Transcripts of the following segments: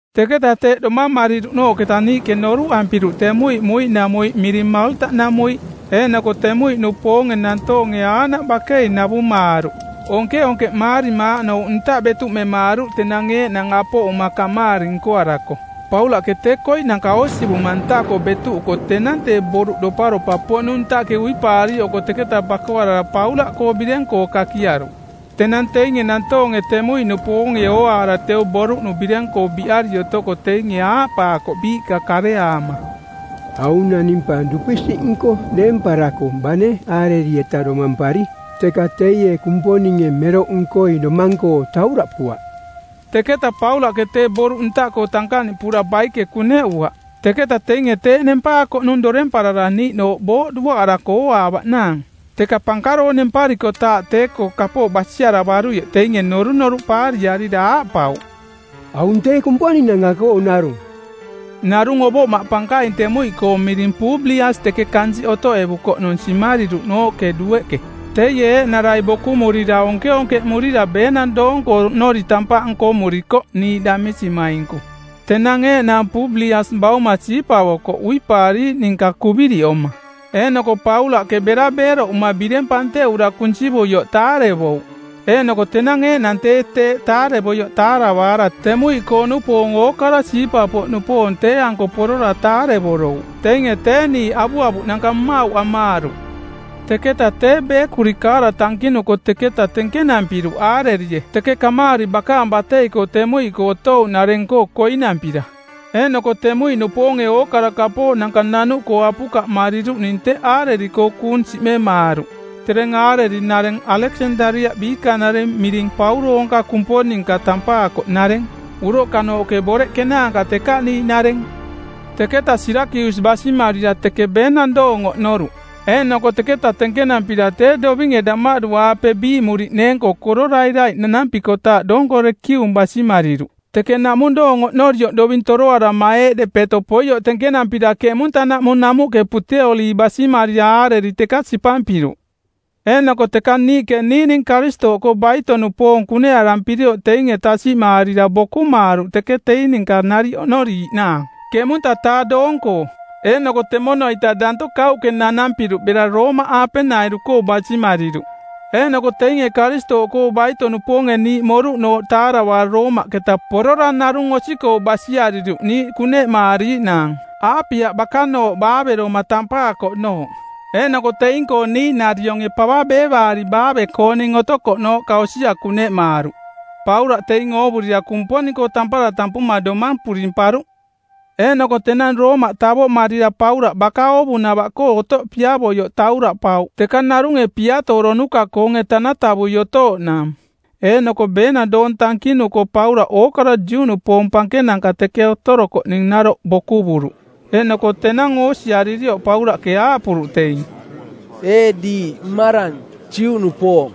Teketa teeꞌ domamariruꞌnooꞌketa niiꞌke noruꞌampiruꞌ temuiꞌ muiꞌnamuiꞌ miring Maalta-namuiꞌ. Eeꞌnoko temuiꞌnupoonge nantoonge aaꞌnaꞌ bakei navumaaruꞌ, onkeonkeꞌmaarima aaꞌnouꞌ ntaꞌ betuꞌmemaaruꞌ tenang eeꞌnang apoꞌuma kamaari nkoarako. Paulaꞌke tee koiꞌnanka oosivuma ntaꞌkoo betuꞌuko tenang tee boruꞌ doparopa-poꞌnung ntaꞌke uipaariiꞌoko teketa bakoarara Paulaꞌkoo bireng-koo kakiaruꞌ. Tenang teinge nantoonge temuiꞌnupoonge ooaara teu boruꞌnu bireng-koo biꞌari otoko teinge aaꞌpaakoꞌ biiꞌka kareaama, “Aung naning pa dupisiꞌnko deemparako bane aareri-eta domampari, teka teie kumponinge meroꞌnkoi domang-koo tauraꞌpuaꞌ.” Teketa Paulaꞌke tee boruꞌ ntaꞌkoo tankaꞌniꞌpura baike kuneꞌuaꞌ. Teketa teinge tee nempaakoꞌnung doremparara niiꞌnooꞌ booꞌ duaꞌarako ooaavaꞌnaang. Teka pankaroong nemparikotaaꞌ tee-koo kapooꞌ basiaravaruioꞌ teinge norunoruꞌ paariarira aaꞌpauꞌ, “Aung tee kumponinanka-koo narung.” Narung ovoꞌmaꞌ pankaing temuiꞌkoong miring Publias teke kansiꞌ otoꞌevukoꞌnung simariruꞌnooꞌke dueꞌke. Teie eeꞌnarai bokumurira onkeonkeꞌmurira beenang doong-koo oꞌnori tampaꞌ nkomurikoꞌ niiꞌ damisimainku. Tenang eeꞌnang Publias bauma siipavoko uipaariiꞌ ninka kuviriꞌoma, eeꞌnoko Paulaꞌke bera beeroꞌuma bireng panteꞌura kunsivuioꞌ taarevouꞌ. Eeꞌnoko tenang eeꞌnang tee teeꞌ taarevoioꞌ taaravaara temuiꞌkoo-nupoong ookara siipa-poꞌnupoong tee-anko porora taarevorouꞌ. Teinge tee niiꞌ avuavuꞌnanka mmauꞌ amaaruꞌ. Teketaꞌ tee beekuri kaara tankinuko teketa tenkenampiruꞌ aarerie teke kamaari bakaang batei-koo temuiꞌkoo otouꞌnareng-koo koinampira. Eeꞌnoko temuiꞌnupoonge ookara kapooꞌnanka nanuꞌkoo apukaꞌmariruꞌning teꞌ aareri-koo kuung siꞌmemaaruꞌ. Tereng aareri-nareng Aleksandariaꞌ biikanareng miring Pauroonka Kumponinka tampaakoꞌnareng, uroꞌkanooꞌke boreꞌ kenaanka tekaꞌniiꞌnareng. Teketa Siirakius basimarira teke beenang doong oꞌnoruꞌ. Eeꞌnoko teketa tenkenampira tee dovinge damaꞌdu-aape biiꞌmuriꞌneeng-koo kororairaiꞌ nanampikotaaꞌ doonko Reekium basimariruꞌ. Teke naꞌmung doong oꞌnorioꞌ doving toroarama eeꞌ depeto poioꞌ tenkenampira keꞌmunta-naꞌmung namuꞌke Puteoli basimarira aareri teka sipampiruꞌ. Eeꞌnoko teka niiꞌke niiꞌning Karistooꞌkoo baito-nupoong kuneꞌarampirioꞌ teing tasiꞌmaarira bokumaaruꞌ teke teing ninka nariꞌ oꞌnoriiꞌnaang ˜keꞌmunta-taa doong-koo. Eeꞌnoko temono-ita daanto kauꞌke nanampiruꞌ bera Roomaꞌaapenairu-koo basimariruꞌ. Eeꞌnoko teinge Karistooꞌkoo baito-nupoonge niiꞌ moruꞌnooꞌ taaravaara Roomaꞌketa porora narung osi-koo basiariruꞌ niiꞌ kuneꞌmaariiꞌnaang, Aapia Bakanooꞌ Baaveroma tampaakoꞌnooꞌ. Eeꞌnoko teing-koo niiꞌnarionge pava beevaari baave-kooning otokoꞌnooꞌka osia kuneꞌmaaruꞌ. Paulaꞌ teing oovurira Kumponing-koo tampara tampuma domang purimparuꞌ. Eeꞌnoko tenang Roomaꞌ tavoꞌmarira Paulaꞌ baka oovunava-koo otoꞌ piavoioꞌ tauraꞌpauꞌ teka narunge piatooronuka-koonge tanatavui otooꞌnaang. Eeꞌnoko beenang doong tankinuko Paulaꞌke ookara Juꞌnupoong pankenanka teke otorokoꞌning naroꞌ bokuvuruꞌ. Eeꞌnoko tenang oosiaririoꞌ Paulaꞌke aaꞌpuruꞌ teing, “Ee diiꞌ mmarang, Juꞌnupoong,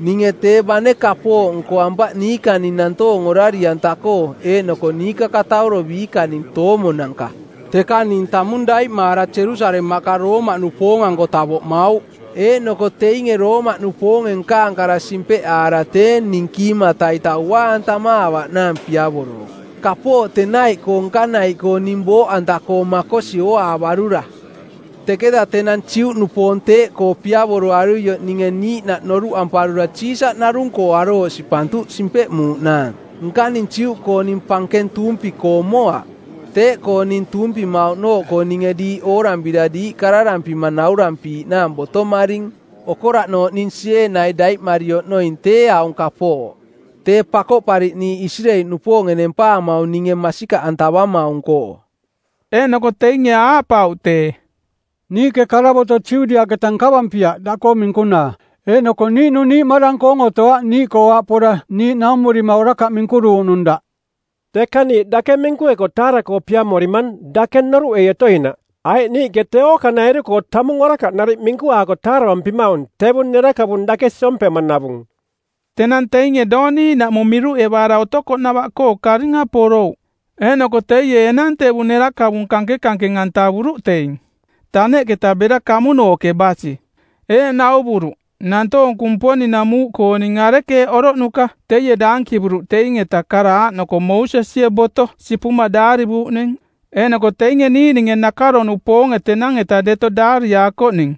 ninge tee bane kapooꞌ nkoampaꞌ niikaning nantoong orari-anta-koo eeꞌnoko niikakatauro biikaning toomonanka, teka ning tamung daiꞌmaara Jerusalemaꞌka Roomaꞌnupoong-anko tavoꞌmauꞌ. Eeꞌnoko teinge Roomaꞌnupoonge nkaang kara simpeꞌaara tee ning kiimata-ita unaa-antamaavaꞌnaang piavorouꞌ, kapooꞌ tenaiꞌkoo nkanaiꞌkoo ning booꞌanta-koo makosi ooaavarura. Teketa tenang Juꞌnupoong teeꞌkoo piavoroaruioꞌ ninge niiꞌnaꞌ noruꞌamparura Siisaꞌ narung-koo arooꞌ sipantuꞌ simpeꞌmuuꞌnaang. Nkaning Juꞌkooning pankeng tuumpi-koo moaꞌ. Teeꞌkoo ning tuumpimauꞌnooꞌkoo ninge diiꞌ oorampira diiꞌ kararampima naurampiiꞌnaang botomaring. Okoraꞌnooꞌ ning sieenai daiꞌmari oꞌnoing tee aung kapooꞌ: Tee Pakoꞌpariꞌniiꞌ Isireeli-nupoonge Nempaamaung ninge masikaꞌantavamaung-koo.” Eeꞌnoko teinge aaꞌpauꞌ tee, “Niiꞌke karavoto Judiaꞌketa nkavampiaꞌ daꞌkoo minkunaa, eeꞌnoko niiꞌnung niiꞌmarang-koong otoaꞌ niiꞌkoo aꞌ pora niiꞌ naumurima orakaꞌ minkuruuꞌnung daꞌ. Teka niiꞌ dake minkueko taara-koo piamorimang dake noruꞌei otoinaꞌ, aiꞌ niiꞌke tee ookanairu-koo tamung orakaꞌ nariꞌ minkuaako taaravampimaung tevung nerakavung dake siompemanavung.” Tenang teinge doong niiꞌnaꞌmung miruꞌevaara otokoꞌnava-koo karinga porouꞌ. Eeꞌnoko teie enang tevung nerakavung kankenkankeng-antavuruꞌ teing, taneꞌketa bera kamunooꞌke basi. Eeꞌ nauvuruꞌ, nantoong Kumponing-namuuꞌkooning arekeeꞌ oroꞌnuka teie daankivuruꞌ teing-eta kara aaꞌnoko Moosesie boto sipuma daarivuuꞌning eeꞌnoko teinge niiꞌninge nakaro-nupoonge tenang-eta deto daariaakoꞌning,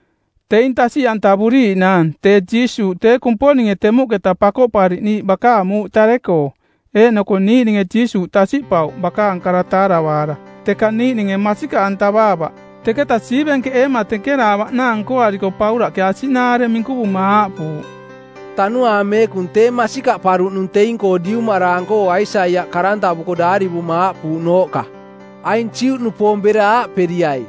teing tasiꞌantavuriiꞌnaang tee Jiisuuꞌ tee Kumponinge temuꞌketa Pakoꞌpariꞌniiꞌ bakaang muuꞌ tare-koo. Eeꞌnoko niiꞌninge Jiisuuꞌ tasiꞌpauꞌ bakaang kara taaravaara, teka niiꞌninge masikaꞌantavaavaꞌ. Teketa siivenkeꞌeema tenkenaavaꞌnaang nkoariko Paulaꞌke asiꞌnaare minkuvuma aaꞌpuuꞌ, “Tanuaang Meekung tee masikaꞌparuꞌnung teing-koo diumaraang-koo Aisaiaꞌ karantavuko˜ daarivuma aaꞌpuuꞌnooꞌka, ‘Aing Juꞌnupoong bera aaꞌperiai,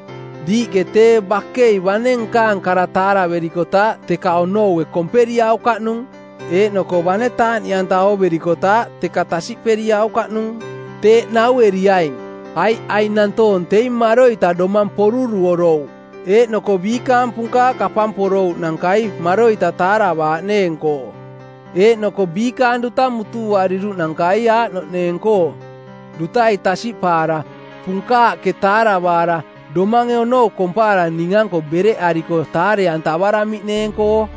Diiꞌke tee bakei bane nkaang kara taaraverikotaaꞌ, teka onoue komperiaukaꞌnung; eeꞌnoko bane taaꞌniꞌanta ooverikotaaꞌ, teka tasiꞌperiaukaꞌnung. Teeꞌ naueriaing, aiꞌ aing nantoong teing maroita domang poruruorouꞌ˜ eeꞌnoko biikaang punkaaꞌ kapamporouꞌnankai maroita taaravaaꞌneeng-koo, eeꞌnoko biikaang duta mutuuariruꞌnankai aaꞌnoꞌneeng-koo: dutai tasiꞌpaara, punkaaꞌke taaravaara, domange onou kompaara ning-anko bereꞌariko taare-antavaramiꞌneeng-koo.’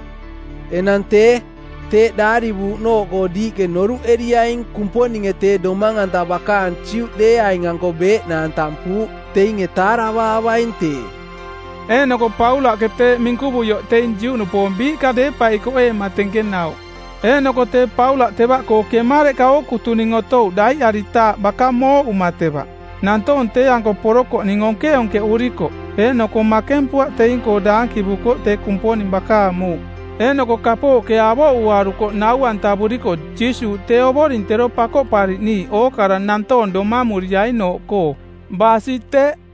“Enang tee, teeꞌ daarivuuꞌnooꞌkoo diiꞌke noruꞌeriaing Kumponinge tee domang-anta bakaang Juꞌdeeaing-anko beeꞌnaang tampuuꞌ. Teinge taaravaavaing tee.” Eeꞌnoko Paulaꞌke teeꞌ minkuvuioꞌ teing Juꞌnupoong biiꞌka deepaikoꞌeema tenkenauꞌ. Eeꞌnoko tee Paulaꞌ tevaꞌkoo kemareꞌka ookutuning otouꞌ daiꞌaritaaꞌ baka mooꞌuma teva. Nantoong tee-anko porokoꞌning onkeonkeꞌurikoꞌ. Eeꞌnoko makempuaꞌ teing-koo daankivukoꞌ tee Kumponing bakaang muuꞌ eeꞌnoko kapooꞌke avoꞌuaruko nau-antavurikoꞌ Jiisuuꞌ tee Ovoring tero Pakoꞌpariꞌniiꞌ ookara nantoong domamuriainooꞌkoo. Basi teꞌ.